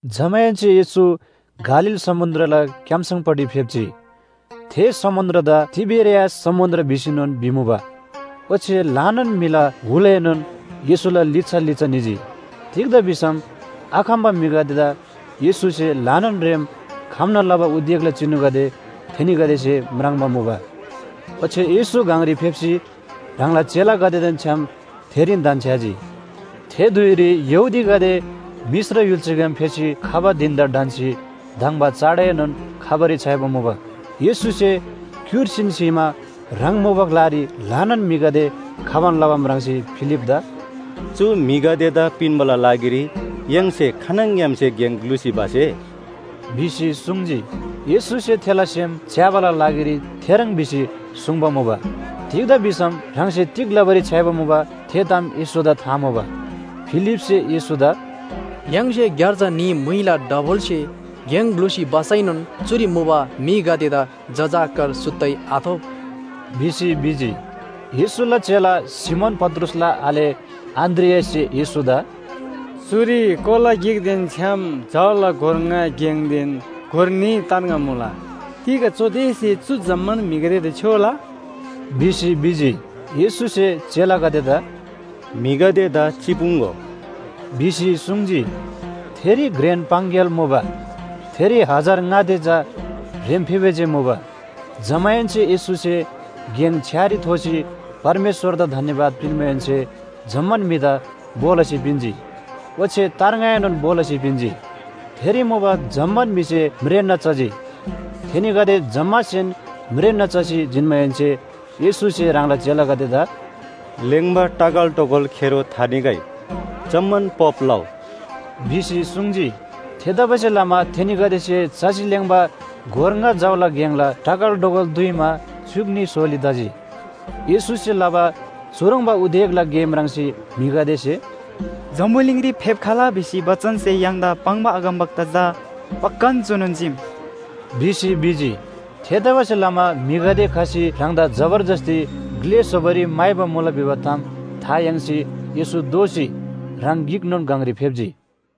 जमाहेन्‍से येशू गालील समुन्‍द्रला क्‍याम्‍सङपट्टि फेप्‍जी। थे समुन्‍द्रदा तिबेरियास समुन्‍द्र भिसीनोन भिमुबा। ओच्‍छे ल्‍हानान म्‍हिला हुलएनोन येशूला लिच्‍छा लिच्‍छा निजी। तिग्‍दा भिसम आखम्‍बा म्‍हिगदेदा येशूसे ल्‍हानान रेम खम्‍ना लबा उदेकला चिनुगदे थेनीगदेसे म्राङ्बा मुबा। ओच्‍छे येशू गङरी फेप्‍सी ह्राङला चेलागदेदेन छ्‌याम थेरीन धन्‍छ्‌याजी। थे धुइरी यहूदीगदेला मिश्र य्‍हुल्‍साग्‍याम फेसी खबा धिन‍दा ढन्‍सी धङ्बा चाडएनोन खबारी छ्‌याइबा मुबा। येशूसे क्‍युर्सीन स्‍हीमा ह्राङ मुबा ग्‍लारी ल्‍हानान म्‍हिगदे खबान लबा म्राङ्सी फिलिपदा “चु म्‍हिगदेदा पिन्‍बाला लागिरी य्‍हाङसे खानङग्‍यामसे गेङ ग्‍लुसी भसे?” भिसी सुङ्जी। येशूसे थेला सेम च्‍याबाला लागिरी थेह्रङ् भिसी सुङ्बा मुबा। तिग्‍दा भिसम ह्राङसे तिग लबारी छ्‌याइबा मुबा, थे ताम येशूदा था मुबा। फिलिपसे येशूदा “य्‍हाङसे ग्‍यार्जा न्‍ही म्‍हुइला डबलसे गेङ ग्‍लुसी भसैनोन चुरी मुबा म्‍हिगदेदा जजाकर सुत्तै आथोप” भिसी भिजी। येशूला चेला सिमोन पत्रुसला आले अन्‍द्रियाससे येशूदा, “चुरी कोला गिकदेन छ्‌याम जौला गोर ङा गेङदेन गोर न्‍ही तार्ङा मुला। तिग चुदेसे चु जम्‍मान म्‍हिगदेदा छ्‍योला?” भिसी भिजी। येशूसे चेलागदेदा “म्‍हिगदेदा चिपुङ्‍गो” भिसी सुङ्जी। थेरी घ्रेन पाङग्‍याल मुबा, थेरी हजार ङा ते चा ह्रेम्‍फेबे जे मुबा। जमाहेन्‍से येशूसे गेङ छ्‌यारी थोसी परमेश्‍वरदा धन्‍यवाद पिन्‍माहेन्‍से जम्‍मान म्‍हिदा भो लसी पिन्‍जी, ओच्‍छे तार्ङाएनोन भो लसी पिन्‍जी। थेरी मुबा जम्‍मान म्‍हिसे म्रेन्‍ना चजी। थेनीगदे जम्‍मासेन म्रेन्‍ना चसी जिन्‍माहेन्‍से येशूसे ह्राङला चेलागदेदा “लेङ्बा टगलटोगोल खेरो थानिगै, जम्‍मान पोप लउ” भिसी सुङ्जी। थेतबासेलमा थेनीगदेसे चसी लेङ्बा गोर ङा जौला गेङला टगलटोगोल दुइमा च्‍युक न्‍ही सोली तजी। येशूसे लबा चुह्रङ्बा उदेकला गे म्राङ्सी म्‍हिगदेसे “जम्‍बुलिङरी फेप्‍खला भिसी बचनसे य्‍हाङदा पाङ्बा अगमवक्ता चा पक्‍कान चुनोन चीम” भिसी भिजी। थेतबासेलमा म्‍हिगदे खसी ह्राङदा जबरजस्‍ती ग्‍ले स्‍होबारी म्‍हाइबा मुला भिबा ताम था याङ्सी येशू दोःसी ह्राङ गिकनोन गङरी फेप्‍जी।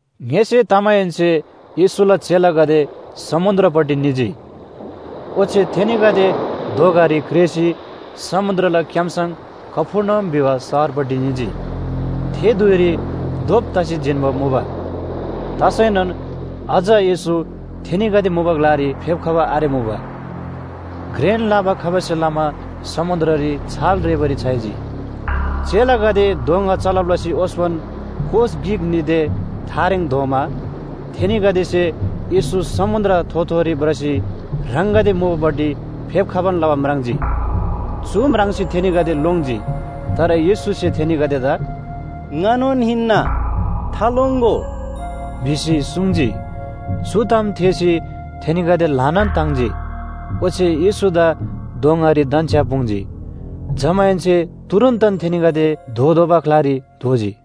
ङ्‍यसे तमाहेन्‍से येशूला चेलागदे समुन्‍द्रपट्टि निजी। ओच्‍छे थेनीगदे दोँगारी क्रेःसी समुन्‍द्रला क्‍याम्‍सङ कफर्नहुम भिबा शहरपट्टि निजी। थे धुइरी धोप तसी जिन्‍बा मुबा, तसैनोन अझ येशू थेनीगदे मुबा ग्‍लारी फेप्‍खबा आरेमुबा। घ्रेन लाबा खबासे लमा समुन्‍द्ररी छाल रेःबारी छ्‌याइजी। चेलागदे दोँगा चलब लसी ओस्‍पन कोस गिक-न्‍ही ते थारेङ धोमा, थेनीगदेसे येशू समुन्‍द्र थोथोरी भ्रसी ह्राङगदे मुबापट्टि फेप्‍खबान लबा म्राङ्जी। चु म्राङ्सी थेनीगदे लोङ्जी। तर येशूसे थेनीगदेदा “ङानोन हिन्‍ना, थालोङ्‍गो” भिसी सुङ्जी। चु ताम थेःसी थेनीगदे ल्‍हानान ताङ्जी, ओच्‍छे येशूदा दोँगारी धन्‍छ्‍यापुङ्जी। जमाहेन्‍से तुरुन्‍तन थेनीगदे धोतोःबा ग्‍लारी धोजी।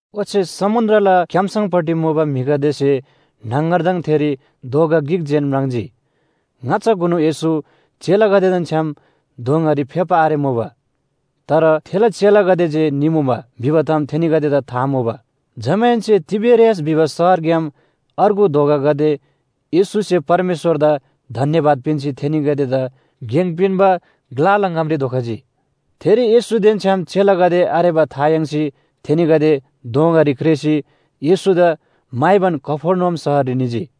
ओच्‍छे समुन्‍द्रला क्‍याम्‍सङपट्टि मुबा म्‍हिगदेसे न्‍हङगरदङ थेरी दोँगा गिक जेन म्राङ्जी। ङाच्‍छाकुनु येशू चेलागदेदेन छ्‌याम दोँगारी फेप्‍बा आरेमुबा, तर थेला चेलागदे जे निमुबा भिबा ताम थेनीगदेदा था मुबा। जमाहेन्‍से तिबेरियास भिबा शहरग्‍याम अर्गु दोँगागदे येशूसे परमेश्‍वरदा धन्‍यवाद पिन्‍सी थेनीगदेदा गेङ पिन्‍बा ग्‍लाला ङामरी धोखजी। थेरी येशूदेन छ्‌याम चेलागदे आरेबा था याङ्सी थेनीगदे दोँगागदेरी क्रेःसी येशूदा म्‍हाइबान कफर्नहुम शहररी निजी।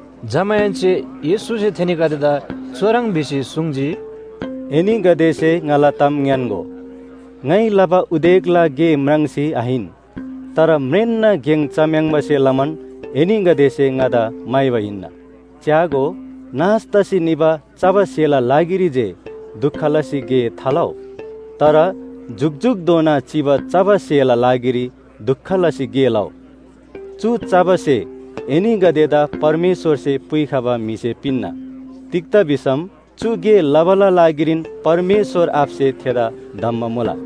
जमाहेन्‍से येशूसे थेनीगदेदा चुह्रङ् भिसी सुङ्जी, “एनीगदेसे ङाला ताम ङ्‌यान्‍गो, ङाइ लबा उदेकला गे म्राङ्सी आहिन, तर म्रेन्‍ना गेङ चम्‍याङ्बासे लमान एनीगदेसे ङादा म्‍हाइबा हिन्‍ना। च्‍यागो, नाश तसी निबा चबा स्‍हेला लागिरी जे दुख लसी गे थालउ, तर जुकजुकधोना चिबा चबा स्‍हेला लागिरी दुख लसी गे लउ। चु चबा स्‍हे एनीगदेदा परमेश्‍वरसे पुइखबा म्‍हिसे पिन्‍ना। तिग्‍दा भिसम चु गे लबाला लागिरीन परमेश्‍वर आबासे थेदा धम्‍बा मुला।”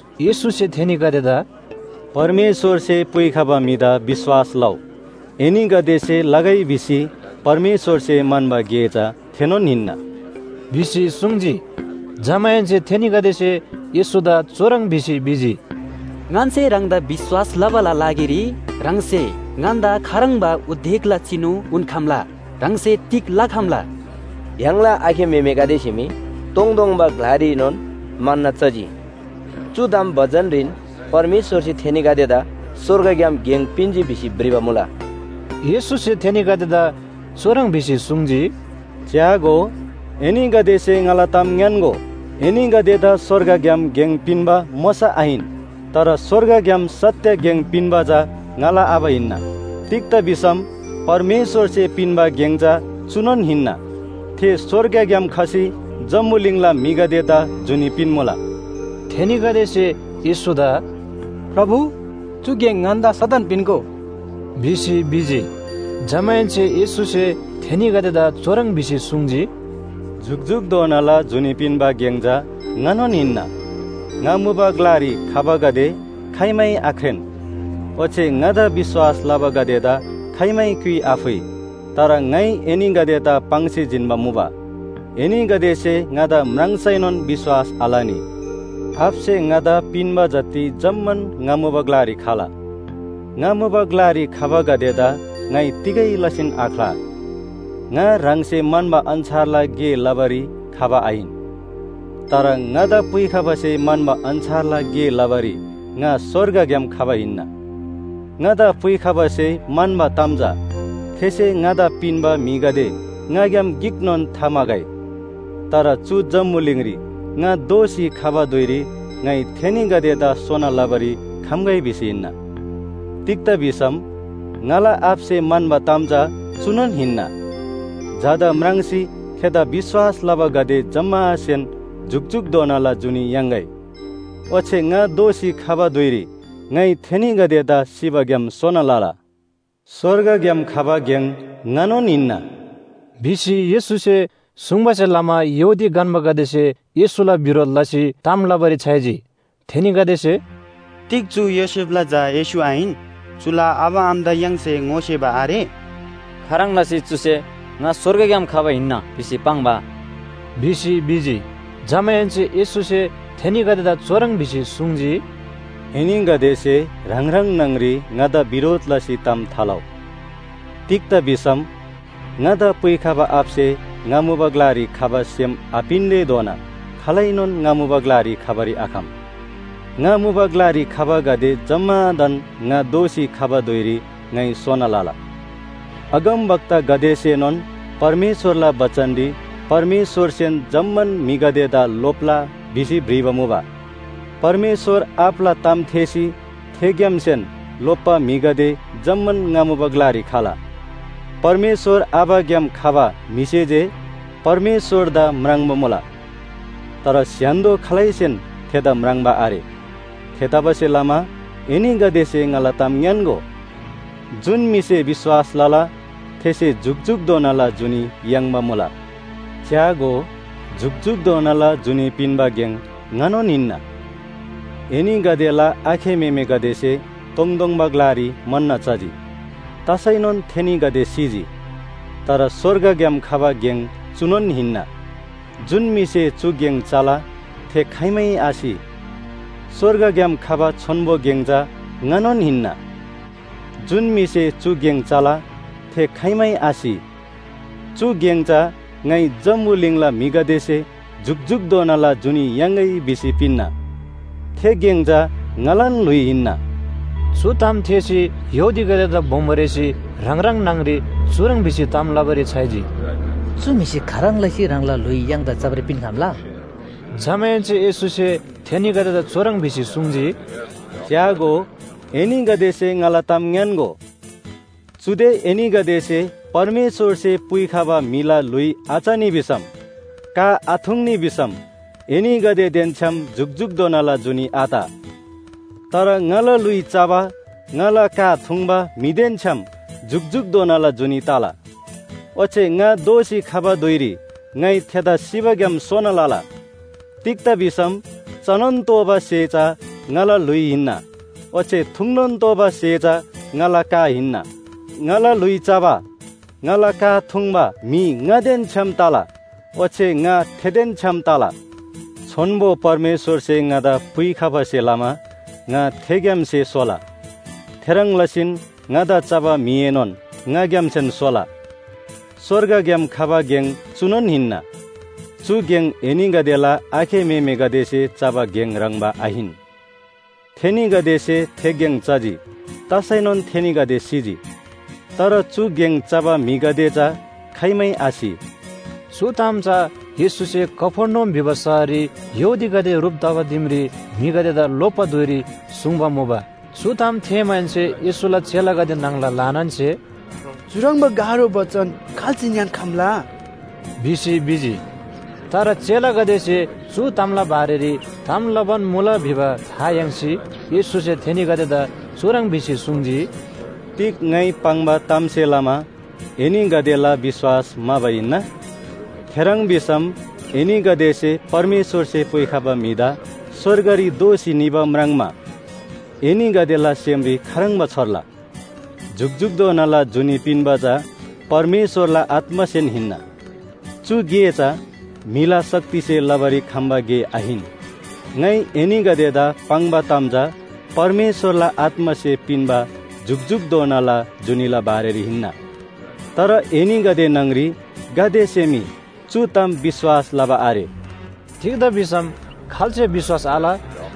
येशूसे थेनीगदेदा “परमेश्‍वरसे पुइखबा म्‍हिदा विश्‍वास लउ, एनीगदेसे लगै भिसी परमेश्‍वरसे म्‍हन्‍बा गे चा थेनोन हिन्‍ना” भिसी सुङ्जी। जमाहेन्‍से थेनीगदेसे येशूदा भिसी भिजी, “ङन्‍से ह्राङदा विश्‍वास लबाला लागिरी ह्राङसे ङन्‍दा खाह्रङ्बा उदेकला चिनु उन्‍खम्‍ला? ह्राङसे तिग लखम्‍ला? य्‍हाङला आखे म्‍हेमेगदेसे मी तोङतोङबा ग्‍लारीएनोन मन्‍न चजी। चु ताम बचनरीन ‘परमेश्‍वरसे थेनीगदेदा स्‍वर्गग्‍याम गेङ पिन्‍जी’ भिसी भ्रिबा मुला।” येशूसे थेनीगदेदा चुह्रङ् भिसी सुङ्जी, “च्‍यागो, एनीगदेसे ङाला ताम ङ्‌यान्‍गो, एनीगदेदा स्‍वर्गग्‍याम गेङ पिन्‍बा मोशा आहिन। तर स्‍वर्गग्‍याम सत्‍य गेङ पिन्‍बा चा ङाला आबा हिन्‍ना। तिग्‍दा भिसम परमेश्‍वरसे पिन्‍बा गेङ चा चुनोन हिन्‍ना, थे स्‍वर्गग्‍याम खसी जम्‍बुलिङला म्‍हिगदेदा जुनी पिन्‍मुला!” थेनीगदेसे येशूदा “प्रभु, चु गेङ ङन्‍दा सदन पिन्‍गो” भिसी भिजी। जमाहेन्‍से येशूसे थेनीगदेदा चुह्रङ् भिसी सुङ्जी, “जुकजुकधोनाला जुनी पिन्‍बा गेङ चा ङानोन हिन्‍ना। ङा मुबा ग्‍लारी खबागदे खाइमै आख्रेन, ओच्‍छे ङादा विश्‍वास लबागदेदा खाइमै क्‍युइ आफुइ। तर ङाइ एनीगदेदा पाङ्सी जिन्‍बा मुबा, एनीगदेसे ङादा म्राङ्सैनोन विश्‍वास आलनी। आबासे ङादा पिन्‍बा जति जम्‍मान ङा मुबा ग्‍लारी खला, ङा मुबा ग्‍लारी खबागदेदा ङाइ तिगै लसीन आख्‍ला। ङा ह्राङसे म्‍हन्‍बा अन्‍छारला गे लबारी खबा आहिन, तर ङादा पुइखबासे म्‍हन्‍बा अन्‍छारला गे लबारी ङा स्‍वर्गग्‍याम खबा हिन्‍ना। ङादा पुइखबासे म्‍हन्‍बा ताम चा थेसे ङादा पिन्‍बा म्‍हिगदे ङाग्‍याम गिकनोन थाम्‍हागै, तर चु जम्‍बुलिङरी ङा दोःसी खबा धुइरी ङाइ थेनीगदेदा सोना लबारी खम्‍गै भिसी हिन्‍ना। तिग्‍दा भिसम ङाला आबासे म्‍हन्‍बा ताम चा चुनोन हिन्‍ना, झादा म्राङ्सी थेदा विश्‍वास लबागदे जम्‍मासेन जुकजुकधोनाला जुनी याङ्‌गै, ओच्‍छे ङा दोःसी खबा धुइरी ङाइ थेनीगदेदा सिबाग्‍याम सोना लला।” “स्‍वर्गग्‍याम खबा गेङ ङानोन हिन्‍ना” भिसी येशूसे सुङ्बासे लमा यहूदी गन्‍बागदेसे येशूला बिरोध लसी ताम लबारी छ्‌याइजी। थेनीगदेसे, “तिग चु योसेफला झा येशू आहिन?, चुला आबा आमादा य्‍हाङसे ङोसेबा आरे?, खाह्रङ् लसी चुसे ‘ङा स्‍वर्गग्‍याम खबा हिन्‍ना’ भिसी पाङ्बा” भिसी भिजी। जमाहेन्‍से येशूसे थेनीगदेदा चुह्रङ् भिसी सुङ्जी, “एनीगदेसे ह्राङ ह्राङ न्‍हङ‍री ङाला बिरोध लसी ताम थालउ। तिग्‍दा भिसम ङादा पुइखबा आबासे ङा मुबा ग्‍लारी खबा सेम आपिन्‍तेधोना खालैनोन ङा मुबा ग्‍लारी खबारी आखम। ङा मुबा ग्‍लारी खबागदे जम्‍मादान ङा दोःसी खबा धुइरी ङाइ सोना लला। अगमवक्तागदेसेनोन परमेश्‍वरला बचनरी ‘परमेश्‍वरसेन जम्‍मान म्‍हिगदेदा लोप्‍ला’ भिसी भ्रिबा मुबा। परमेश्‍वर आबाला ताम थेःसी थेग्‍यामसेन लोप्‍बा म्‍हिगदे जम्‍मान ङा मुबा ग्‍लारी खला। परमेश्‍वर आबाग्‍याम खबा म्‍हिसे जे परमेश्‍वरदा म्राङ्बा मुला। तर स्‍य्‍हान्‍दो खालैसेन थेदा म्राङ्बा आरे। थेतबासेलमा एनीगदेसे ङाला ताम ङ्‌यान्‍गो, जुन म्‍हिसे विश्‍वास लला थेसे जुकजुकधोनाला जुनी याङ्बा मुला। च्‍यागो, जुकजुकधोनाला जुनी पिन्‍बा गेङ ङानोन हिन्‍ना। एनीगदेला आखे म्‍हेमेगदेसे तोङतोङबा ग्‍लारी मन्‍न चजी, तसैनोन थेनीगदे सिजी। तर स्‍वर्गग्‍याम खबा गेङ चुनोन हिन्‍ना, जुन म्‍हिसे चु गेङ चला थे खाइमै आसि। स्‍वर्गग्‍याम खबा छोन्‍बो गेङ चा ङानोन हिन्‍ना, जुन म्‍हिसे चु गेङ चला थे खाइमै आसि। चु गेङ चा ङाइ जम्‍बुलिङला म्‍हिगदेसे जुकजुकधोनाला जुनी याङ्‌गै भिसी पिन्‍ना। थे गेङ चा ङालान ल्‍हुइ हिन्‍ना।” चु ताम थेःसी यहूदीगदेदा बोमो रेःसी ह्राङ ह्राङ न्‍हङ‍री चुह्रङ् भिसी ताम लबारी छ्‌याइजी, “चु म्‍हिसे खाह्रङ् लसी ह्राङला ल्‍हुइ य्‍हाङदा चबारी पिन्‍खम्‍ला?” जमाहेन्‍से येशूसे थेनीगदेदा चुह्रङ् भिसी सुङ्जी, “च्‍यागो, एनीगदेसे ङाला ताम ङ्‌यान्‍गो, चुदे एनीगदेसे परमेश्‍वरसे पुइखबा म्‍हिला ल्‍हुइ आचनी भिसम, का आथुङ्नी भिसम एनीगदेदेन छ्‌याम जुकजुकधोनाला जुनी आत। तर ङाला ल्‍हुइ चबा, ङाला का थुङ्बा म्‍हिदेन छ्‌याम जुकजुकधोनाला जुनी तला। ओच्‍छे ङा दोःसी खबा धुइरी ङाइ थेदा सिबाग्‍याम सोना लला। तिग्‍दा भिसम चनोन तोःबा स्‍हे चा ङाला ल्‍हुइ हिन्‍ना ओच्‍छे थुङ्नोन तोःबा स्‍हे चा ङाला का हिन्‍ना। ङाला ल्‍हुइ चबा, ङाला का थुङ्बा म्‍हि ङादेन छ्‌याम तला, ओच्‍छे ङा थेदेन छ्‌याम तला। छोन्‍बो परमेश्‍वरसे ङादा पुइखबासे लमा ङा थेग्‍यामसे सोला, थेह्रङ् लसीन ङादा चबा म्‍हिएनोन ङाग्‍यामसेन सोला। स्‍वर्गग्‍याम खबा गेङ चुनोन हिन्‍ना। चु गेङ एनीगदेला आखे म्‍हेमेगदेसे चबा गेङ ह्रङ्‌बा आहिन। थेनीगदेसे थे गेङ चजी तसैनोन थेनीगदे सिजी। तर चु गेङ चबा म्‍हिगदे चा खाइमै आसि।” चु ताम चा येशूसे कफर्नहुम भिबा शहररी यहूदीगदे ह्रुप तबा दिमरी म्‍हिगदेदा लोप्‍बा धुइरी सुङ्बा मुबा। चु ताम थेःमाहेन्‍से येशूला चेलागदे न्‍हङला ल्‍हानानसे “चुह्रङ्बा गाह्रो बचन खाल्‍से ङ्‍यान्‍खम्‍ला?” भिसी भिजी। तर चेलागदेसे चु तामला बारेरी ताम लबान मुला भिबा था याङ्सी येशूसे थेनीगदेदा चुह्रङ् भिसी सुङ्जी, “तिग ङाइ पाङ्बा तामसे लमा एनीगदेला विश्‍वास म्‍हाबा हिन्‍ना? थेह्रङ् भिसम एनीगदेसे परमेश्‍वरसे पुइखबा म्‍हिदा स्‍वर्गरी दोःसी निबा म्राङ्मा एनीगदेला सेमरी खाह्रङ्बा छोर्ला? जुकजुकधोनाला जुनी पिन्‍बा चा परमेश्‍वरला आत्‍मासेन हिन्‍ना। चु गे चा म्‍हिला शक्तिसे लबारी खम्‍बा गे आहिन। ङाइ एनीगदेदा पाङ्बा ताम चा परमेश्‍वरला आत्‍मासे पिन्‍बा जुकजुकधोनाला जुनीला बारेरी हिन्‍ना। तर एनीगदे न्‍हङ‍री गातेसे मी चु ताम विश्‍वास लबा आरे।” तिग्‍दा भिसम खाल्‍से विश्‍वास आल,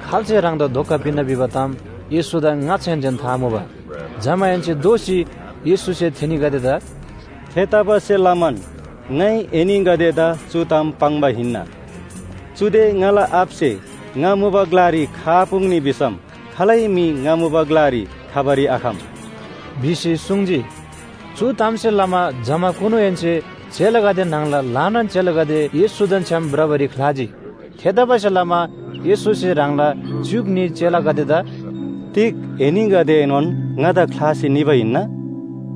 खाल्‍से ह्राङदा धोका पिन्‍ना भिबा ताम येशूदा ङाच्‍छाहेन्‍सेन था मुबा। जमाहेन्‍से दोःसी येशूसे थेनीगदेदा “थेतबासेलमान ङाइ एनीगदेदा चु ताम पाङ्बा हिन्‍ना, चुदे ङाला आबासे ङा मुबा ग्‍लारी खआपुङ्नी भिसम खालै म्‍हि ङा मुबा ग्‍लारी खबारी आखम” भिसी सुङ्जी। चु तामसे लमा जमाकुनुहेन्‍से चेलागदे न्‍हङला ल्‍हानान चेलागदे येशूदेन छ्‌याम भ्रबारी ख्‍लाजी। थेतबासेलमा येशूसे ह्राङला च्‍युक न्‍ही चेलागदेदा “तिग एनीगदेएनोन ङादा ख्‍लासी निबा हिन्‍ना?”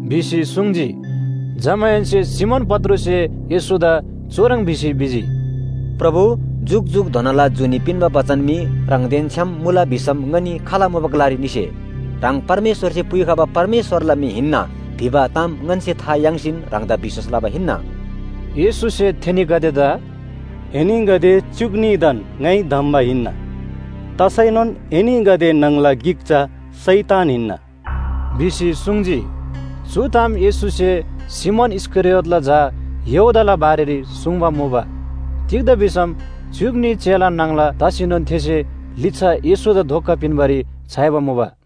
भिसी सुङ्जी। जमाहेन्‍से सिमोन पत्रुससे येशूदा भिसी भिजी, “प्रभु, जुकजुकधोनाला जुनी पिन्‍बा बचन मी ह्राङदेन छ्‌याम मुला भिसम ङनी खाल मुबा ग्‍लारी निसे? ह्राङ परमेश्‍वरसे पुइखबा परमेश्‍वरला म्‍हि हिन्‍ना भिबा ताम ङन्‍से था याङ्सीन ह्राङदा विश्‍वास लबा हिन्‍ना।” येशूसे थेनीगदेदा “एनीगदे च्‍युक न्‍हीदान ङाइ धम्‍बा हिन्‍ना, तसैनोन एनीगदे न्‍हङला गिक चा शैतान हिन्‍ना” भिसी सुङ्जी। चु ताम येशूसे सिमोन इस्‍करियोतला झा यहूदाला बारेरी सुङ्बा मुबा। तिग्‍दा भिसम च्‍युक न्‍ही चेला न्‍हङला तसीनोन थेसे लिच्‍छा येशूदा धोका पिन्‍बारी छ्‌याइबा मुबा।